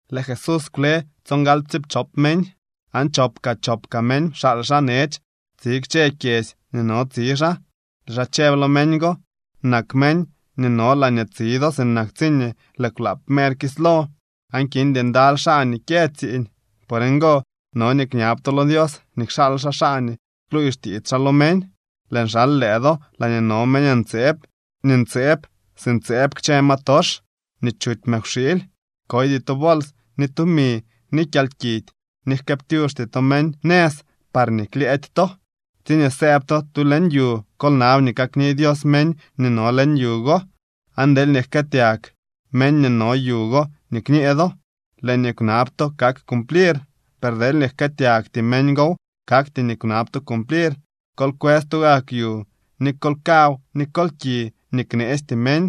Lëë Jesús kwle stsongaly ptsiipchop meñ, aan chop kaa chop kaa meñ pxaal xaa nech tsi kchë kyedzy nii no tsi xaa. Lëë xaa chëb lo meñ go: —Nak meñ nii no laañee tsi do sinak tsiñee lëë kwlaap mer kislo aan kindy ndaly xaa nii kyë tsiiñ. Por ngo no nii kñab to lo Dios nii kxaal xaa xaa nii kluuy xtiits xaa lo meñ. Lëën xal lëë do laañee no meñ ntseeb nii ntseeb si ntseeb kchë ma tox nii chuty mëkwxiily. Koydy to bols ni tumi ni kyalkidy, ni jkëëptyuxty to meñ nëz parñee klyëëdy to. Tsiñee sëëb to tu leñ yu, kol nab nii kakni Dios meñ nii no leñ yu go. Aan deelñee jkëëtyag meñ nii no yu go nii kñee do, lëë nii kwnab to kak cumplir, per deelñee jkëëtyagty meñ gow, kakty nii kwnab to cumplir. Kol kwës tugak yu, ni kol kaw ni kol ki nii kneestyee meñ,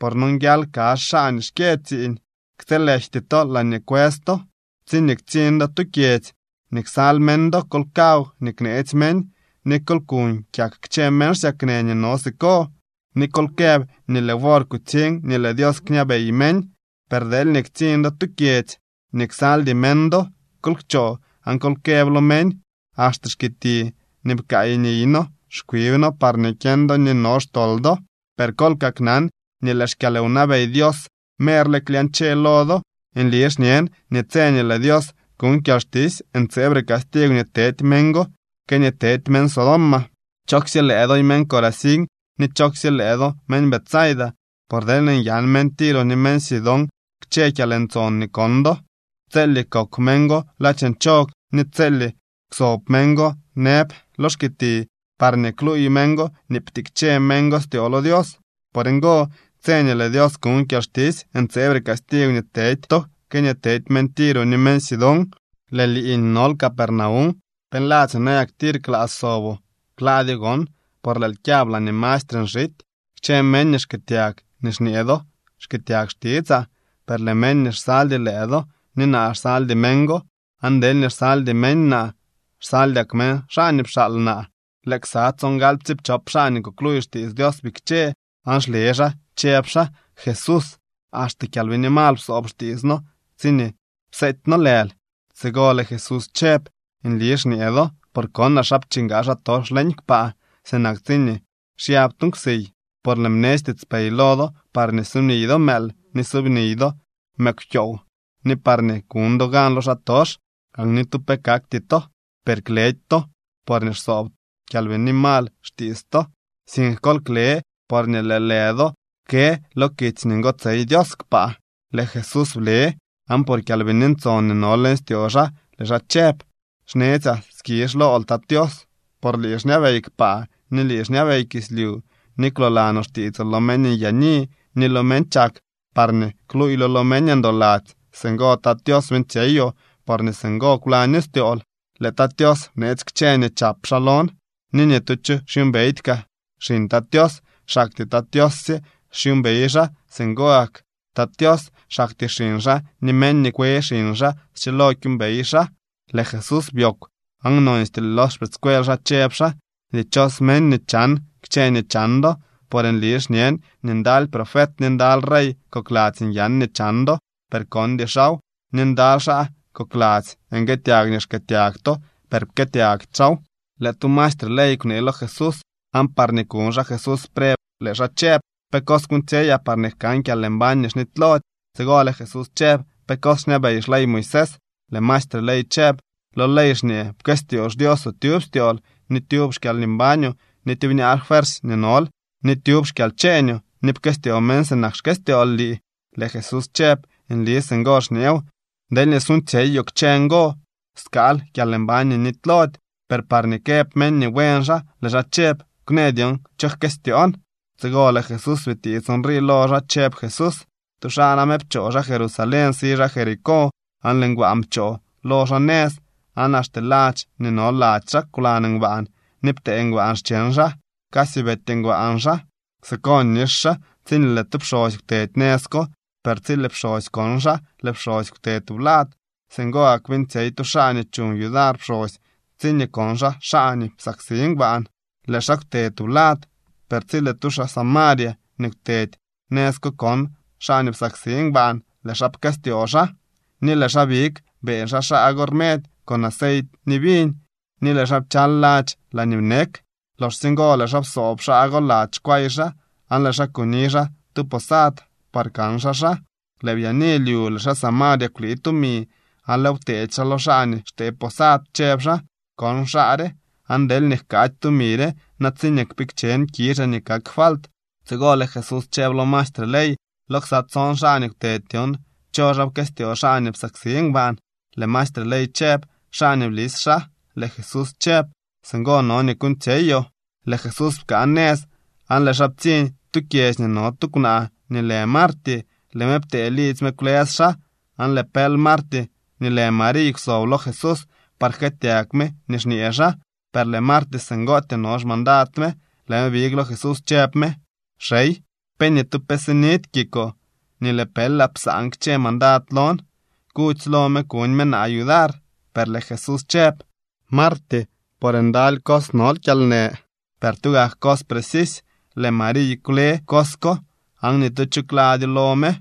por nonguial kazh xaa nii xkyë tsiiñ. Ktsëëlejty to laañee kwës to. Tsiñee ktsiñ do tu kyedzy nii ksal meñ do, kol kaw nii kneetsy meñ, ni kol kuuñ kyak kchë meñ xsyaknë nii no siko, ni kol këb nii lëë wor kutsiñ nii lëë Dios kñabey meñ. Per deelñee ktsiñ do tu kyedzy nii ksaldy meñ do, kol kchoo aan kol këb lo meñ: “Axte xkiti nii pkaay niy noo xkwib noo parñee kyeñ do nii no xtol do. Per kol kaknan nii lëë xkyalwnabey Dios merle klyañche lo do.” Nli xñen nii tse nii lëë Dios kuñ kyalxtisy ntseebre castigw nii tedy meñ go que nii tedy meñ Sodoma. ’¡Chooksye lëë doy meñ Corazín ni chooksye lëë do meñ Betsaida! Por deelñee nyan meñ Tiro ni meñ Sidón kchë kyalntson nii kon do, tselye kokw meñ go ladx nchog ni tselye kwsob meñ go nëb lo xkiti parñee kluuy meñ go nii ptikche meñ go styoo lo Dios. Por ngo, tse nii lëë Dios kuñ kyalxtisy ntseebre castigw nii tedy to que nii tedy meñ Tiro ni meñ Sidón. Lëë lii nii nol Capernaum, ¿pe nladzyoo nayak tir klaa soboo? Klaadyoo gon, por lëël kyab laañee mastre nxity. ’Kchë meñ nii xkëëtyag nii xñee do xkëëtyag xtitsaa, per lëë meñ nii xsaldy lëë do, ni naa xsaldy meñ go. Aan deelñee xsaldy meñ naa, xsaldyak meñ xaa nii pxaal naa. Lëë ksa tsongaly ptsiipchop xaa nii kukluuy xtiits Dios bikche aan xle xaa chëb xaa: —Jesús, axte kyalbini mal psoob xtiits noo tsiñee pseety noo lël. Tsigo lëë Jesús chëb: —Nli xñee do, por konaa xa pchingaa xaatox leñ kpaa sinak tsiñee xyab tu nkwsiy. Por lëën bnetsy tiitspey lo do parñee subniy do mëël ni subniy do mëkwkyoow, ni parñee kuñ do gan lo xaatox, aan ni tu pe kakty to. Per kledy to porñee xsoob kyalbini mal xtiits to, sink kol kle porñee lëë lë do kë lo kitsy nii ngotsey Dios kpaa. Lëë Jesús ble, aan por Kyalbini Ntson nii no leñ styoo xaa lëë xaa chëb: —Xnetsyaa skizh lool, Tat Tios, por lii xñabey kpaa ni lii xñabey kislyu, ni kwloolanoo xtiitsoo lo meñ nyaani ni lo meñ chak parñee kluuylo lo meñ ndoladzy. Singo Tat Tios beeñtsyeyoo, porñee singo kwlaño styool. ’Lëë Tat Tios bneetsy kchë nii chap xaa lon. Ni ni tu cho xyuumbeydy kaa xiñ Tat Tios. Xaktyee Tat Tios sye xyuumbey xaa. Singo gak kaa Tat Tios, xaktyee xiñ xaa ni meñ nii kwe xiñ xaa schilo kyuumbey xaa. Lëë Jesús byoogw aan nonstyee lo xpëëdscuel xaa chëb xaa: —Dichos meñ nii chan kchë nii chan do. Por nli xñen nii ndaly profet ni ndaly rey kokladzy nyan nii chan do, per kondy xaaw. Ni ndaly xaa kokladzy nguëëtyag nii xkëëtyag to, per pkëëtyagty xaaw. Lëë tu maestre ley kunee lo Jesús, aan parñee kuñ xaa Jesús preb, lëë xaa chëb: —¿Pe cos kuuñtsyeyaa parñee jkan kyalmbañ nii xnitylody? Tsigo lëë Jesús chëb: —¿Pe cos xñabey xley Moisés? Lëë maestre ley chëb: —Lo ley xñee: “Pkëstyoo xDioosoo tyub styool, ni tyub xkyalmbañoo, ni tyubñaa fuersy nii nol, ni tyub xkyalcheeñoo. Ni pkëstyoo meñ sinak xkëstyool lii.” Lëë Jesús chëb: —Nli singo xñeew. Deelñee suuñtsyeyoo kchë ngo, skaal kyalmbañ nii nitylody. Per parñee këb meñ nii buen xaa, lëë xaa chëb: —Kwnë dyon cho jkëstyoon. Tsigo lëë Jesús bitiits nrii lo xaa, chëb Jesús: —Tu xaa name pchoo xaa Jerusalén, si xaa Jericó. Aan lëë ngbaan pchoo lo xaa nëz, aan axte ladx nii no lady xaa kwlan ngbaan ni ptee ngbaan xcheñ xaa. Casy beety ngbaan xaa. Siko nix xaa tsiñee lëë tu pxosy kwtedy nëz ko. Per tsi lëë pxosy kon xaa, lëë pxosy kwte tublad. Singo gak beeñtsyey tu xaa nii chuñ yudar pxosy tsiñee kon xaa xaa nii psaksi ngbaan. Lëë xaa kwte tublad. Per tsi lëë tu xaa Samaria nii kwtedy nëz ko kon xaa nii psaksi ngbaan, lëë xaa pkëstyoo xaa, ni lëë xaa big beeñ xaa xaa go rmedy con aceit ni viñ, ni lëë xaa pchal ladx laañee bnek. Loxsye ngo lëë xaa psoob xaa go lady xkway xaa, aan lëë xaa kuni xaa tu posad par kan xaa xaa. Lëë byaani lyu lëë xaa Samaria kwlii tumi aan lëëw pteedy xaa lo xaa nii xtee posad, chëb xaa: “Kon xaa re, aan deelñee jkaady tumi re, na tsiñee kpikchen kizhaa nii kak falt.” Tsigo lëë Jesús chëb lo maestre ley: —Lo ksa tson xaa nii kwtedy dyon, ¿cho xaa pkëstyoo xaa nii psaksi ngbaan? Lëë maestre ley chëb: —Xaa nii blis xaa. Lëë Jesús chëb: —Singo no nii kuuñtsyeyoo. Lëë Jesús pkaa nëz, aan lëë xaa ptsiñ tu kyedzy nii no tu kwnaa nii lë Marty. Lëë me ptee lidzy me kwlës xaa. Aan lëë pël Marty nii lë Mariy kwsob lo Jesús par jkëëtyag me nii xñee xaa. Per lëë Marty singootyee no xmandad me, lëë me big lo Jesús, chëb me: —Xey, ¿pe ni tu pe sinidy kikoo nii lëë pëlaa psaan kchë mandad lon? Kudzy lo me kuñ me naa yudar. Per lëë Jesús chëb: —Marty, por ndaly cos nol kyalnë, per tugak cos precisy. Lëë Mariy kwle cos ko, aan ni tu cho kladyo lo me.